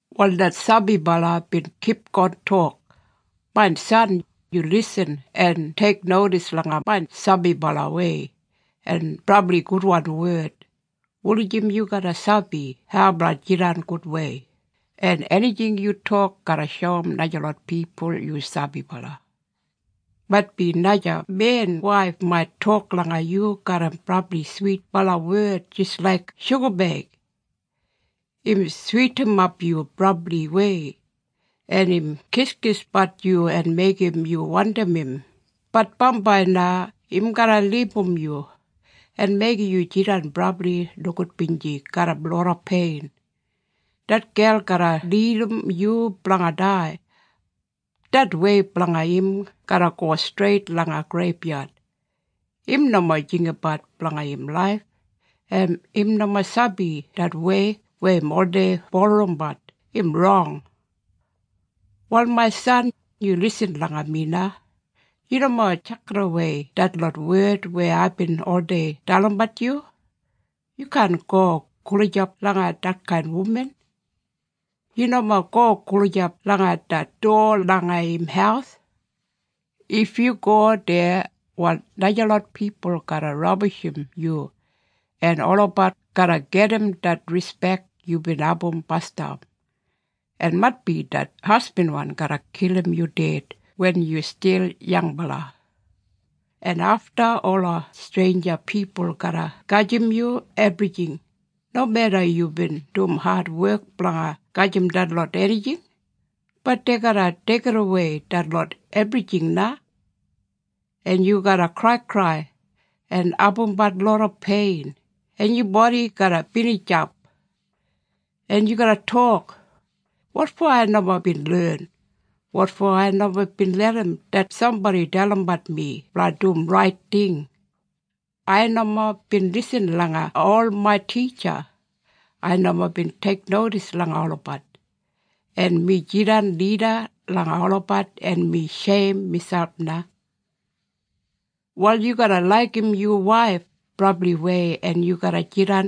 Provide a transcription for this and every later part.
Wal det sabibala bin kipgon tok, “Main san, yu lisin en teiknodis langa main sabibalawei en brabli gudwan wed, wulijim yu garra sabi hau blanga jidan gudwei, en enijing yu tok garra shoum najalot pipul yu sabibala. Maitbi naja men waif mait tok langa yu garram brabli switbala wed jis laik shugabeig. Im switinimap yu brabliwei en im kiskisbat yu en meigim yu wandim im, bat bambai na im garra libum yu en meigim yu jidan brabli nogudbinji garram loda pein. Det gel garra lidim yu blanga dai. Det wei blanga im garra go streit langa greibyad. Im nomo jinggabat blanga im laif, en im nomo sabi det wei weya im oldei bulurrumbat, im rong. “Wal main san, yu lisin langa mi na. Yu nomo tjakidawei detlot wed weya aibin oldei dalimbat yu. Yu kaan go gulijap langa detkain wuman. Yu nomo go gulijap langa det dowa langa im haus. If yu go deya wal najalot pipul garra rabishim yu en olabat garra gedim det rispek yubin abum basdam, en maitbi det hasbinwan garra kilim yu ded wen yu stil yangbala. En afta ola streinja pipul garra gajim yu ebrijing, nomeda yubin dum adwek blanga gajim detlot enijing, bat dei garra deigidawei detlot ebrijing na, en yu garra kraikrai en abumbat loda pein en yu bodi garra binijap. En yu garra tok, ‘Wotfo ai nomo bin len? Wotfo ai nomo bin larram det sambodi dalimbat mi blanga dum rait ting? Ai nomo bin lisin langa ol main titja. Ai nomo bin teiknodis langa olabat. En mi jidan lida langa olabat en mi sheim miselp na.’ “Wal yu garra laigim yu waif brabliwei en yu garra jidan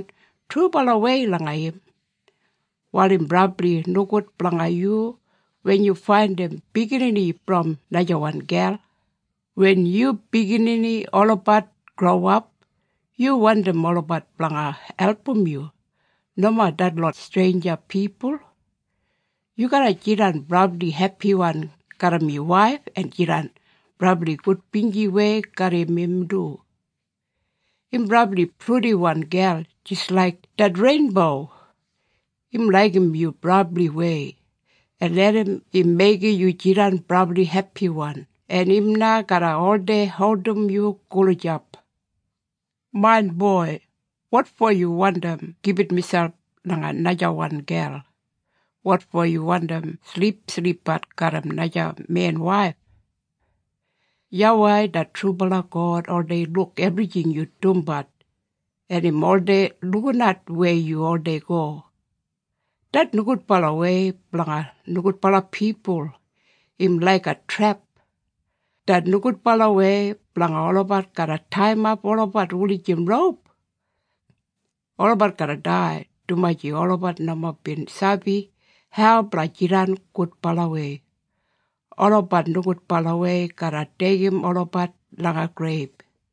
trubalawei langa im. Wal im brabli nogud blanga yu wen yu faindim biginini brom najawan gel. Wen yu biginini olabat growap, yu wandim olabat blanga album yu, nomo detlot streinja pipul. Yu garra jidan brabli hepiwan garram yu waif en jidan brabli gudbinjiwei garram im du. Im brabli purdiwan gel jis laik det reinbo. Im laigim yu brabliwei, en larram im meigim yu jidan brabli hepiwan en im na garra oldei holdim yu gulijap. Main boi, wotfo yu wandim gibit miselp langa najawan gel? Wotfo yu wandim silipsilipbat garram naja men waif? YAWEI det trubala God oldei luk ebrijing yu dumbat en im oldei lukinat weya yu oldei go. Det nogudbalawei blanga nogudbala pipul im laiga trep. Det nogudbalawei blanga olabat garra taiyimap olabat wulijim roup. Olabat garra dai, dumaji olabat nomo bin sabi hau blanga jidan gudbalawei. Olabat nogudbalawei garra deigim olabat langa greib.”